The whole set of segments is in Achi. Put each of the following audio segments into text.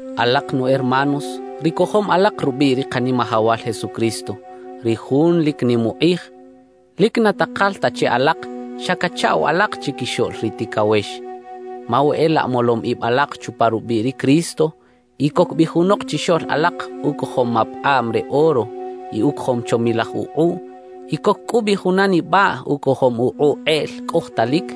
Alaq nu hermanos, ri kojom alaq rubꞌiꞌ ri Qanimajawal Jesucristo, ri Jun lik nim uqꞌij, lik na taqal ta che alaq xa kachaꞌw alaq chikixoꞌl ri tikawex. Ma we e laꞌ molom ibꞌ alaq chupa rubꞌiꞌ ri Cristo y kok bꞌi junoq chixoꞌl alaq ukojom mapaqꞌabꞌ re oro y ukojom chomilaj uqꞌuꞌ y kok kꞌu bꞌi juna nibꞌaꞌ ukojom uqꞌuꞌ qꞌeꞌl kꞌojtalik,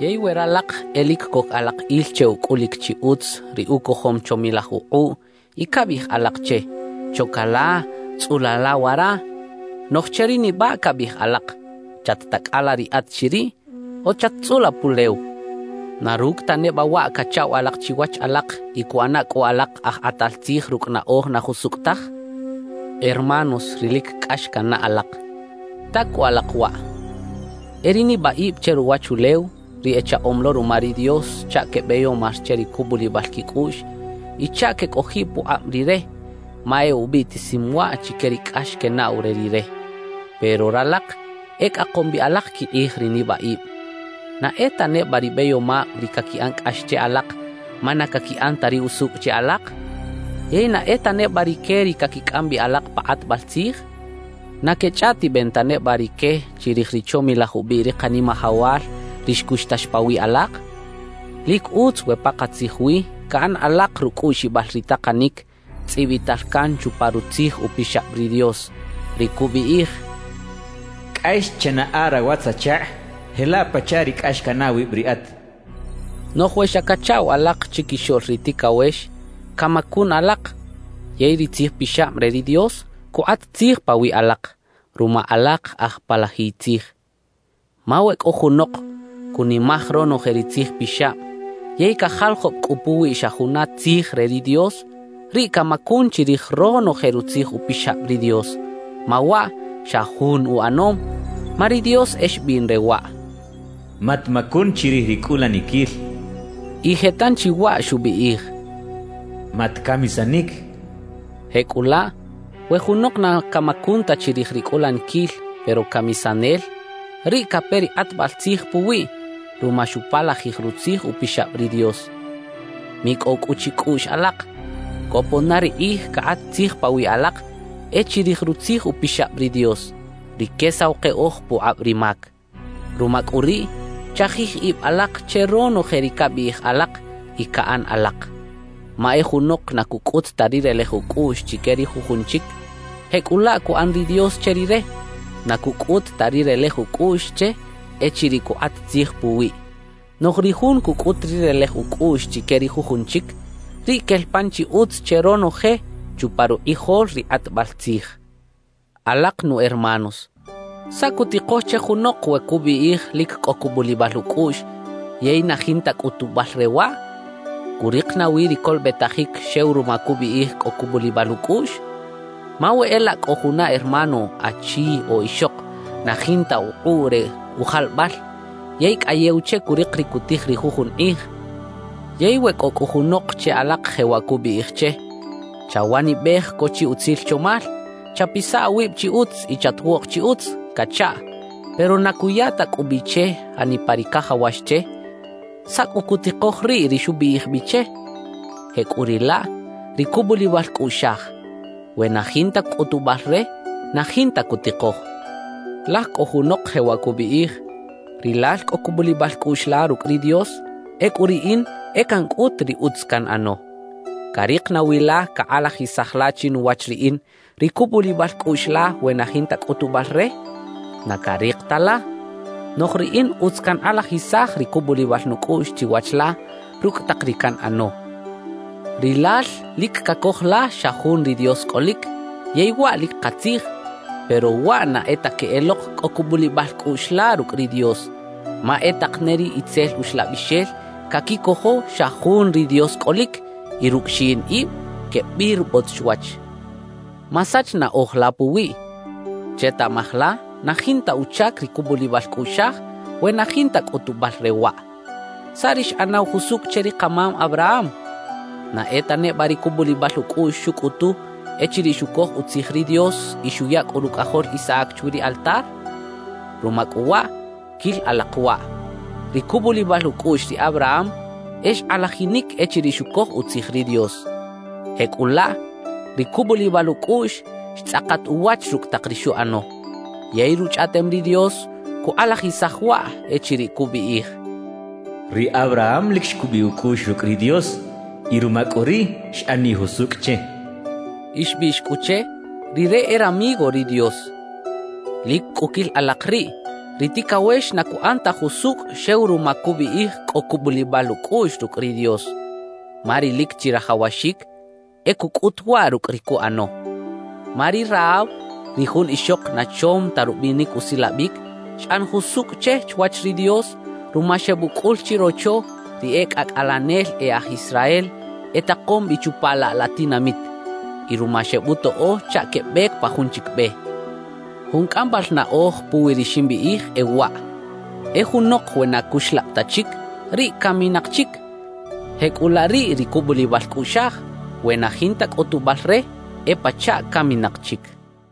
yey we ralaq e lik kok alaq il che ukꞌulik chi utz ri ukojom chomilaj uqꞌuꞌ y kabꞌiꞌij alaq che: «Choka la, tzꞌula la wara»; noꞌj che ri nibꞌaꞌ kabꞌiꞌij alaq: «Chat-takꞌala riꞌat chiriꞌ o chat-tzꞌula pulew»; ¿na rukꞌ ta nebꞌa waꞌ kachaꞌw alaq chiwach alaq y kuꞌana kꞌu alaq aj qꞌatal tzij rukꞌ naꞌoj na jusukꞌ taj? Hermanos ri lik kꞌax kannaꞌ alaq, ta kꞌu alaq waꞌ: E ri nibꞌaꞌibꞌ che ruwachulew ri echaꞌom lo ruma ri Dios chaꞌ kebꞌeyomar che ri kubꞌulibꞌal kikꞌuꞌx y chaꞌ kekꞌojiꞌ puqꞌabꞌ Rire ma e ubꞌiꞌtisim waꞌ chike ri kꞌax kenaꞌw re Rire. Pero ralaq e kꞌaqom bꞌi alaq kiqꞌij ri nibꞌaꞌibꞌ. ¿Na e ta nebꞌa ri bꞌeyomabꞌ ri kakiꞌan kꞌax che alaq ma na kakiꞌan ta ri usukꞌ che alaq? ¿Yey na e ta nebꞌa rike ri kakikꞌam bꞌi alaq pa qꞌatbꞌal tzij? ¿Na kechꞌaꞌtibꞌen ta nebꞌa rike chirij ri chomilaj ubꞌiꞌ ri Qanimajawal, ri xkuxtax pawiꞌ alaq? Lik utz we paqatzij wi kaꞌan alaq rukꞌuꞌxibꞌal ri taqanik tzꞌibꞌital kan chupa Rutzij Upixabꞌ ri Dios, ri kubꞌiꞌij: «Kꞌax chanaꞌa rawatz-achaqꞌ jelaꞌ pachaꞌ ri kꞌax kanaꞌ awibꞌ riꞌat.» Noꞌj we xa kachaꞌw alaq chikixoꞌl ri tikawex, kamakun alaq yey ri Tzij Pixabꞌ re ri Dios kuqꞌat tzij pawiꞌ alaq ruma alaq aj palajiy tzij. Ma we kꞌo junoq kunimaj ronoje ri Tzij Pixabꞌ yey kajaljobꞌ kꞌu puwi xa juna tzij re ri Dios, riꞌ kamakun chirij ronoje Rutzij Upixabꞌ ri Dios, ma waꞌ xa jun uꞌanom. Ma ri Dios e xbꞌiꞌn re waꞌ: «Matmakun chirij ri kꞌulanikil» y je tanchi waꞌ xubꞌiꞌij: «Matkamisanik.» Jekꞌulaꞌ, we junoq na kamakun ta chirij ri kꞌulanikil pero kamisanel, riꞌ kape ri qꞌatbꞌal tzij puwiꞌ ruma xupalajij Rutzij Upixabꞌ ri Dios. Mikꞌow kꞌu chikꞌuꞌx alaq, kopon na ri qꞌij kaqꞌat tzij pawiꞌ alaq e chirij Rutzij Upixabꞌ ri Dios, ri kesaw qeꞌoj puqꞌabꞌ ri mak. Ruma kꞌu riꞌ, chajij ibꞌ alaq che ronoje ri kabꞌiꞌij alaq y kaꞌan alaq. Ma e junoq na kukꞌut ta ri relej ukꞌuꞌx chike ri jujun chik, jekꞌulaꞌ kuꞌan ri Dios che rire, na kukꞌut ta ri relej ukꞌuꞌx che echiriꞌ kuqꞌat tzij puwiꞌ; noꞌj ri jun kukꞌut ri relej ukꞌuꞌx chike ri jujun chik, riꞌ kel pan chi utz che ronoje chupa ruqꞌijol ri qꞌatbꞌal tzij. Alaq nu hermanos, ¿saꞌ kutiqoj che junoq we kubꞌiꞌij lik kꞌo kubꞌulibꞌal ukꞌuꞌx yey na jinta kꞌutubꞌal re waꞌ? ¿Kuriq nawi ri kolobꞌetajik xew ruma kubꞌiꞌij kꞌo kubꞌulibꞌal ukꞌuꞌx? Ma we e laꞌ kꞌo juna hermano achi o ixoq na jinta uqꞌuꞌ re ujalbꞌal yey kꞌayew che kuriq ri kutij ri jujun qꞌij, yey we kꞌo kꞌu junoq che alaq jewaꞌ kubꞌiꞌij che: «Chawanibꞌej ko chi utzil chomal, chapisa awibꞌ chi utz y chatwoꞌq chi utz» kachaꞌ, pero na kuya ta kꞌu bꞌi che janipa ri kajawax che, ¿saꞌ kꞌu kutiqoj riꞌ ri xubꞌiꞌij bꞌi che? Jekꞌuriꞌlaꞌ ri kubꞌulibꞌal kꞌuꞌxaj, we na jinta kꞌutubꞌal re, na jinta kutiqoj. Laj kꞌo junoq jewaꞌ kubꞌiꞌij: «Rilal kꞌo kubꞌulibꞌal kꞌuꞌx la rukꞌ ri Dios; ekꞌu riꞌin e kankꞌut ri utz kanꞌano. ¿Kariq nawi la kaqꞌalajisaj la chinuwach riꞌin ri kubꞌulibꞌal kꞌuꞌx la we na jinta kꞌutubꞌal re? ¡Na kariq ta la! Noꞌj riꞌin utz kanqꞌalajisaj ri kubꞌulibꞌal nukꞌuꞌx chiwach la rukꞌ taq ri kanꞌano.» Rilal lik kakoj la xa jun ri Dios kꞌolik, yey waꞌ lik qatzij. Pero waꞌ na e ta keꞌeloq kꞌo kubꞌulibꞌal kꞌuꞌx la rukꞌ ri Dios, ma e taq ne ri itzel uxlabꞌixel kakikojo xa jun ri Dios kꞌolik y rukꞌ xiꞌin ibꞌ kebꞌirbꞌot chwach. Masach naꞌoj la puwiꞌ; chetaꞌmaj la na jinta uchak ri kubꞌulibꞌal kꞌuꞌxaj we na jinta kꞌutubꞌal re waꞌ. ¿Saꞌ ri xꞌanaw jusukꞌ che ri qamam Abraham? ¿Na e ta nebꞌa ri kubꞌulibꞌal ukꞌuꞌx xukꞌutu echiriꞌ xukoj utzij ri Dios y xuya kꞌu rukꞌajol Isaac chwi ri altar? Ruma kꞌu waꞌ, kil alaq waꞌ: Ri kubꞌulibꞌal ukꞌuꞌx ri Abraham e xqꞌalajinik echiriꞌ xukoj utzij ri Dios. Jekꞌulaꞌ, ri kubꞌulibꞌal ukꞌuꞌx xtzꞌaqat uwach rukꞌ taq ri xuꞌano. Yey Ruchꞌaꞌtem ri Dios kuqꞌalajisaj waꞌ echiriꞌ kubꞌiꞌij: «Ri Abraham lik xkubꞌiꞌ ukꞌuꞌx rukꞌ ri Dios y ruma kꞌu riꞌ, xꞌaniꞌ jusukꞌ che.» Y xbꞌiꞌx kꞌu che: «Rire e ramigo ri Dios.» Lik kꞌu kil alaq riꞌ: Ri tikawex na kuꞌan ta jusukꞌ xew ruma kubꞌiꞌij kꞌo kubꞌulibꞌal ukꞌuꞌx rukꞌ ri Dios, ma ri lik chirajawaxik e kukꞌut waꞌ rukꞌ ri kuꞌano. Ma ri Rahab, ri jun ixoq na chom ta rubꞌinik usilabꞌik, xꞌan jusukꞌ che chwach ri Dios ruma xebꞌukꞌul chirocho ri e kꞌakꞌalenel e aj Israel etaqom bꞌi chupa laꞌ la tinamit y ruma xebꞌutoꞌo chaꞌ kebꞌek pa jun chik bꞌe. Jun kꞌambꞌal naꞌoj puwi ri ximbꞌiꞌij e waꞌ: E junoq we na kuxlabꞌ ta chik, riꞌ kaminaq chik; jekꞌulaꞌ riꞌ ri kubꞌulibꞌal kꞌuꞌxaj, we na jinta kꞌutubꞌal re, e pachaꞌ kaminaq chik.